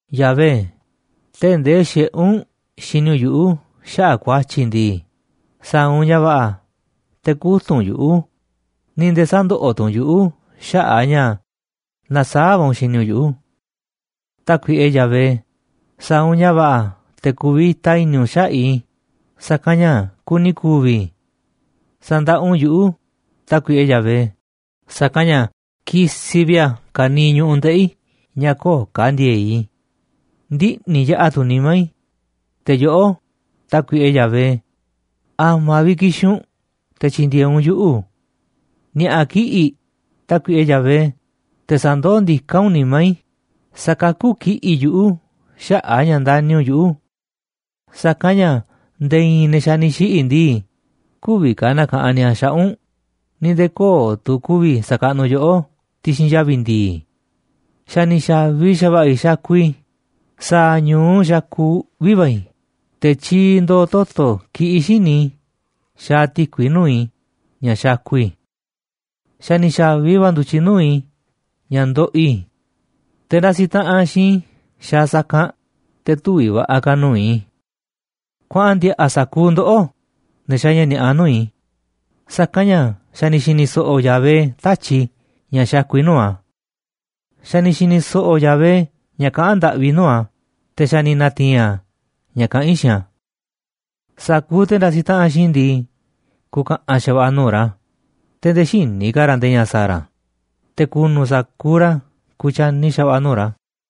Yahvé, tee̱ꞌ ndee xiꞌé u̱nꞌ xini u̱nꞌ yuꞌu̱ xaꞌa̱ꞌ ku̱a̱tyi̱ i̱ ndii, sa̱a̱ u̱nꞌ ña̱ va̱ꞌa̱ te̱ kü̱tunꞌ u̱nꞌ yuꞌu̱, ni̱ nde̱e̱ sä̱ndoꞌoꞌ tu̱ u̱nꞌ yuꞌu̱ xaꞌa̱ꞌ a̱ ña̱ nasaáꞌ va̱ u̱nꞌ xini u̱nꞌ yuꞌu̱. Tákuiꞌe Yahvé, sa̱a̱ u̱nꞌ ña̱ va̱ꞌa̱ te̱ ku̱vi̱ta i̱ni̱ u̱nꞌ xaꞌa̱ꞌ i̱, sa̱kanꞌ ña̱ kuni ku̱vi̱ i̱. Sa̱ndaꞌa u̱nꞌ yuꞌu̱, Tákuiꞌe Yahvé, sa̱kanꞌ ña̱ kisiꞌ vi̱ꞌ a̱ ka̱niiꞌ ñu̱ꞌuꞌ ndeꞌi̱ i̱ ña̱ köo̱ꞌ ka̱ ndi̱e̱e̱ꞌ i̱. Ndiꞌni̱ yaꞌa̱ tu̱ nimá i̱, te̱ yoꞌó, Tákuiꞌe Yahvé, ¿a̱ma̱ vi̱ꞌ ki̱xi̱n u̱nꞌ te̱ tyi̱ndi̱e̱eꞌ u̱nꞌ yuꞌu̱? Ni̱a̱ꞌa̱ kiꞌi̱ꞌ, Tákuiꞌe Yahvé, te̱ sa̱ndoó ndiká u̱nꞌ nimá i̱, sa̱kakú kiꞌi̱ꞌ yuꞌu̱ xaꞌa̱ꞌ a̱ ña̱ ndani̱ u̱nꞌ yuꞌu̱. Sa̱kanꞌ ña̱ nde̱e̱ i̱i̱n ne̱ xa̱ ni̱ xiꞌi̱ ndii, kü̱vi̱ ka̱ na̱ka̱ꞌanꞌ ni̱a̱ xaꞌa̱ꞌ u̱nꞌ, ni̱ nde̱e̱ köo̱ꞌ tu̱ ku̱vi̱ sa̱kaꞌnuꞌ yoꞌó ti̱xi̱n yavi̱ ndi̱i̱. Xa̱ ni̱ xa̱vi xa̱va̱ꞌa̱ i̱ xakuꞌ i̱, sa̱a̱ ñu̱u xakuꞌ uꞌvi̱ va̱ i̱, te̱ tyiiꞌ ndooꞌ toto̱ kiꞌiꞌ xíniꞌ i̱ xaaꞌ ti̱kui nuu̱ꞌ i̱ ña̱ xakuꞌ i̱. Xa̱ ni̱ xa̱vi va̱ ndu̱tyiꞌ nuu̱ꞌ i̱ ña̱ ndoꞌoꞌ i̱. Te̱ ndasi taꞌanꞌ xiinꞌ i̱ xaaꞌ sa̱kanꞌ, te̱ tüviꞌ va̱ꞌa̱ ka̱ nuu̱ꞌ i̱. Kuaꞌan ndi̱a̱ꞌa̱ sa̱kuuꞌ ndoꞌó, ne̱ xaaꞌ ña̱ ni̱a̱ꞌa nuu̱ꞌ i̱, sa̱kanꞌ ña̱ xa̱ ni̱ xi̱ni̱ so̱ꞌo̱ Yahvé tatyi̱ꞌ i̱ ña̱ xakuꞌ i̱ nuu̱ꞌ a̱. Xa̱ ni̱ xi̱ni̱ so̱ꞌo̱ Yahvé ña̱ kaꞌán ndaꞌvi i̱ nuu̱ꞌ a̱, te̱ xa̱ ni̱ na̱ti̱i̱n a̱ ña̱ kaꞌán i̱ xiinꞌ a̱. Sa̱kuuꞌ te̱ ndasiꞌ taꞌanꞌ xiinꞌ i̱ ndii, ku̱ka̱ꞌa̱n xa̱va̱ꞌa̱ nuu̱ꞌ ra̱, te̱ nde̱e̱ xïní ka̱ ra̱ nde̱e̱ ña̱ sa̱a̱ ra̱, te̱ ku̱nu̱ sa̱kuuꞌ ra̱ kutyani xa̱va̱ꞌa̱ nuu̱ꞌ ra̱.